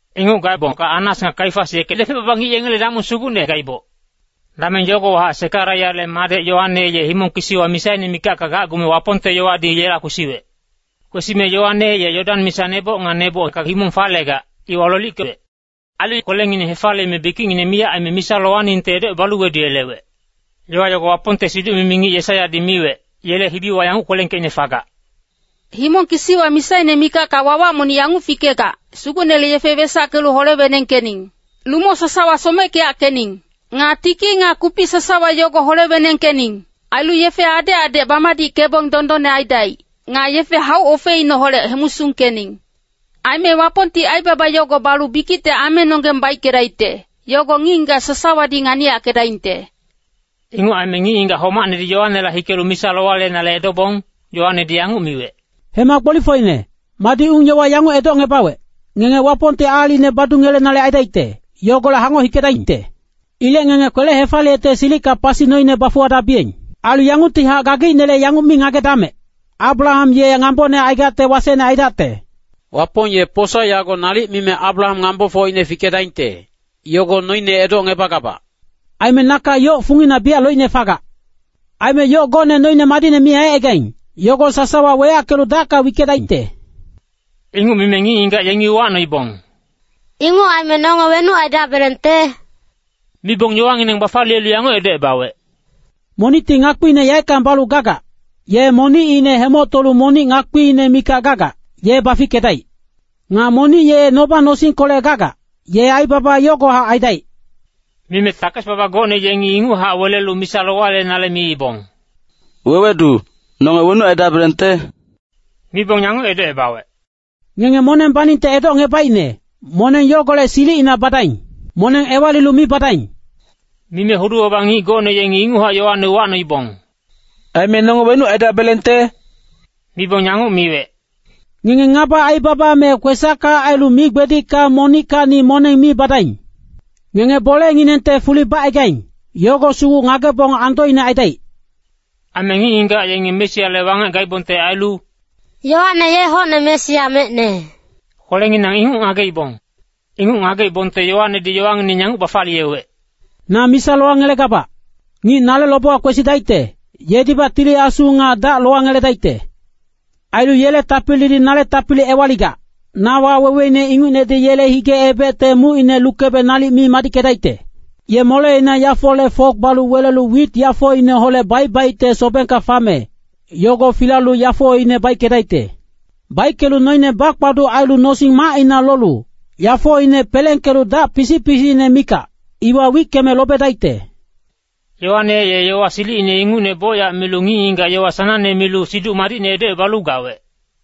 Inguc gaebongka Annas nga Kaifas yeke depec-baba ngic yengele damong sugucne gaiboc. Dameng yogowahac Sekariyale madec Yoane, ye himong kisiwa misaine mikacka gacgume Wapongte yowadi yela kwesiwec. Kwesime Yoane ye Yodan misa neboc nga nebocka himong falegac, iwa lolickewec. Ailu kwelengineng hefaliyeme bikicngineng miyac aime misa lowaningte edocebalu weduyelewec. Yowa yogo Wapongte siduc-mimi ngic Yesaiyadi miwec, yele hibiwa yanguc kwelengkeicne fagac, “Himong kisiwa misaine mikacka wawac monic yanguc fikegac, ‘Sugucnele yefe wesackelu hole-wenengkening. Lumo sasawa someckeyackening. Nga tiki nga kupic sasawa yogo hole-wenengkening. Ailu yefe adec adec bamadickebong dondonne aidaic. Nga yefe hauc-ofecineholec hemusungkening. Aime Wapongti aibaba yogo balu bikicte amenonggeng baickedaicte, yogo ngic-ngigac sasawadi nganiyackedaingte.’” Inguc aime ngic-ngigac homacnedi Yoanela hikelu misa lowayelenale edobong, Yoanedi yanguc miwec, “Hema gbolifocine, madi ung-yowa yanguc edocngebawec, ngenge Wapongti aalicine badungelenale aidaicte, yogolec hangoc hikedaingte? Ilec ngenge kwele-hefaliyecte silicka pasi noine bafuwadabiyeng. Ailu yanguctihac gageicnele yanguc mi ngagedamec, ‘Abraham ye ngambone aigacte wasecne aidacte.’ Wapong ye posa yago nalic mime Abraham ngambofocine fikedaingte, yogo noine edocngebagabac. Aime naka yoc fungina biyac loicne fagac. Aime yoc gocne noine madicne mi aicaigaing, yogo sasawa weyackelu dacka wickedaingte.” Inguc mime ngic-ngigac yengi uwacnoibong, “Inguc aime nonge wenuc aidabelengte?” Mibong yowangineng bafaliyelu yanguc edocebawec, “Monicti ngakpiine yaeckang balu gagac, ye monicine hemoctolu monic ngakpiine mikac gagac, ye bafickedaic. Nga monic ye noba-nosingkolec gagac, ye aibaba yogohac aidaic.” Mime takes-baba gocne yengi inguchac welelu misa lowayelenale miibong, “Wewedu, nonge wenuc aidabelengte?” Mibong yanguc edocebawec, “Ngenge moneng baningte edocngebaicne, moneng yogolec silicina badaing. Moneng ewalilu mi badaing.” Mime hudu-baba ngic gocne yengi inguchac Yoane uwacnoibong, “Aime nonge wenuc aidabelengte?” Mibong yanguc miwec, “Ngenge ngaba aibaba me kwesacka ailu migbedicka monickacni moneng mi badaing. Ngenge bolenginengte fuli bacaigaing, yogo sugu ngagebong andoine aidaic.” Aime ngic-ngigac yenge Mesiale wangec gaibongte ailu “Yoane ye hocne Mesia mecne,” kwelenginang inguc ngageibong. Inguc ngageibongte Yoanedi yowangineng yanguc bafaliyewec, “Na misa lowangelegabac. Ngic nale lobewa kwesidaicte, yedibac Tili Asu nga dac lowangeledaicte. Ailu yele tapilidi nale tapili ewaligac, na waweweine ingucnedi yele hige-ebecte mucine lukebe nalic mi madickedaicte. Ye moleina yafole fok balu welelu wit yafoineholec baic-baicte sobengka fame, yogo filalu yafoine baickedaicte. Baickelu noine bakpaduc ailu nosing-macina lolu, yafoine pelengkelu dac pisic-pisicine mikac, iwa wickeme lobedaicte.” Yoane ye yowa silicine ingucne bocyac milu ngic-ngigac yowa sanangne milu Siduc Madicne edocebalu gawec.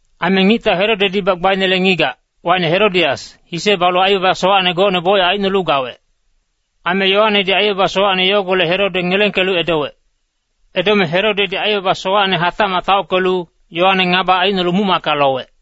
Aime ngictau Herodedi gbainele ngigac wacine Herodias, hise balu aibaba sowacne gocne bocyac aicnolu gawec. Aime Yoanedi aibaba sowacne yogolec Herode ngelengkelu edowec. Edome Herodedi aibaba sowacne hatacmac taockelu, Yoane ngaba aicnolu muc-macka lowec.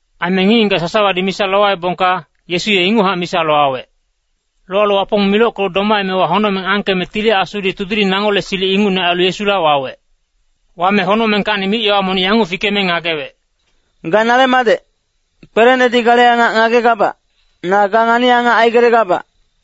Aime ngic-ngigac sasawadi misa lowaebongka, Yesu ye inguchac misa lowawec. Lowalu Wapong milockelu domaemewa, honocmeng angkeme Tili Asudi tudiling nangole silic ingucne ailu Yesula wawec. Wame honocmengkacni mic-yowa monic yanguc fikeme ngagewec, “Ga nale madec, kwelenedi gale angac ngagegabac, na ga ngani-angac aigelegabac.”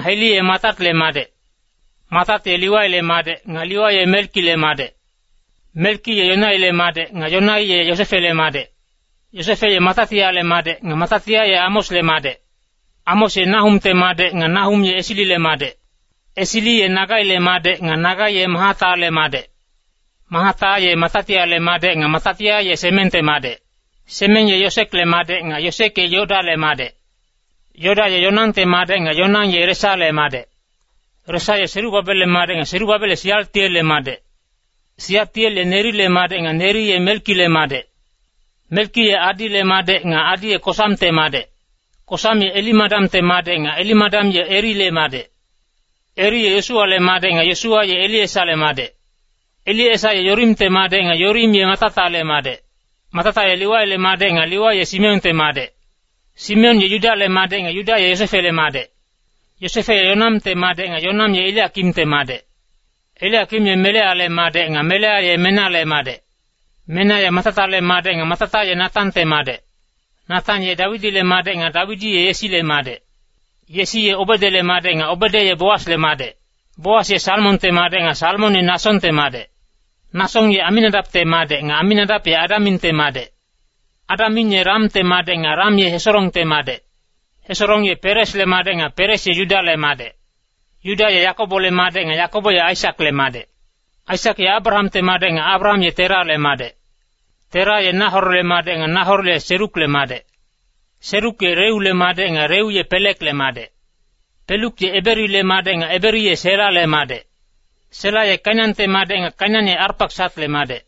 Heli ye Matatle madec. Matat ye Liwaile madec nga Liwai ye Melkile madec. Melki ye Yanaile madec nga Yanai ye Yosefele madec. Yosefe ye Matatiale madec nga Matatia ye Amosle madec. Amos ye Nahumte madec nga Nahum ye Esilile madec. Esili ye Nagaile madec nga Nagai ye Mahatale madec. Mahata ye Matatiale madec nga Matatia ye Semengte madec. Semeng ye Yosekle madec nga Yosek ye Yodale madec. Yoda ye Yonangte madec nga Yonang ye Resale madec. Resa ye Serubabelle madec nga Serubabel ye Sialtielle madec. Sialtiel ye Nerile madec nga Neri ye Melkile madec. Melki ye Adile madec nga Adi ye Kosamte madec. Kosam ye Elimadamte madec nga Elimadam ye Erile madec. Eri ye Yosuwale madec nga Yosuwa ye Eliesale madec. Eliesa ye Yorimte madec nga Yorim ye Matatale madec. Matata ye Liwaile madec nga Liwai ye Simeonte madec. Simeon ye Yudale madec nga Yuda ye Yosefele madec. Yosefe ye Yonamte madec nga Yonam ye Eliakimte madec. Eliakim ye Meleale madec nga Melea ye Menale madec. Mena ye Matatale madec nga Matata ye Natante madec. Natan ye Dawidile madec nga Dawidi ye Yesile madec. Yesi ye Obedele madec nga Obede ye Boasle madec. Boas ye Salmonte madec nga Salmon ye Nasongte madec. Nasong ye Aminadapte madec nga Aminadap ye Adaminte madec. Adamin ye Ramte madec nga Ram ye Hesorongte madec. Hesorong ye Peresle madec nga Peres ye Yudale madec. Yuda ye Yakobole madec nga Yakobo ye Aisakle madec. Aisak ye Abrahamte madec nga Abraham ye Terale madec. Tera ye Nahorle madec nga Nahor ye Serukle madec. Seruk ye Reule madec nga Reu ye Pelekle madec. Pelek ye Eberile madec nga Eberi ye Selale madec. Sela ye Kainante madec nga Kainan ye Arpaksatle madec.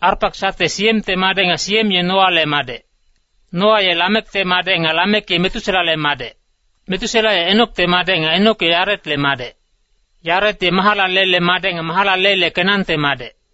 Arpaksat ye Siemte madec nga Siem ye Noale madec. Noa ye Lamekte madec, nga Lamek ye Metuselale madec. Metusela ye Enokte madec nga Enok ye Yaretle madec. Yaret ye Mahalalelle madec nga Mahalalel ye Kenante madec.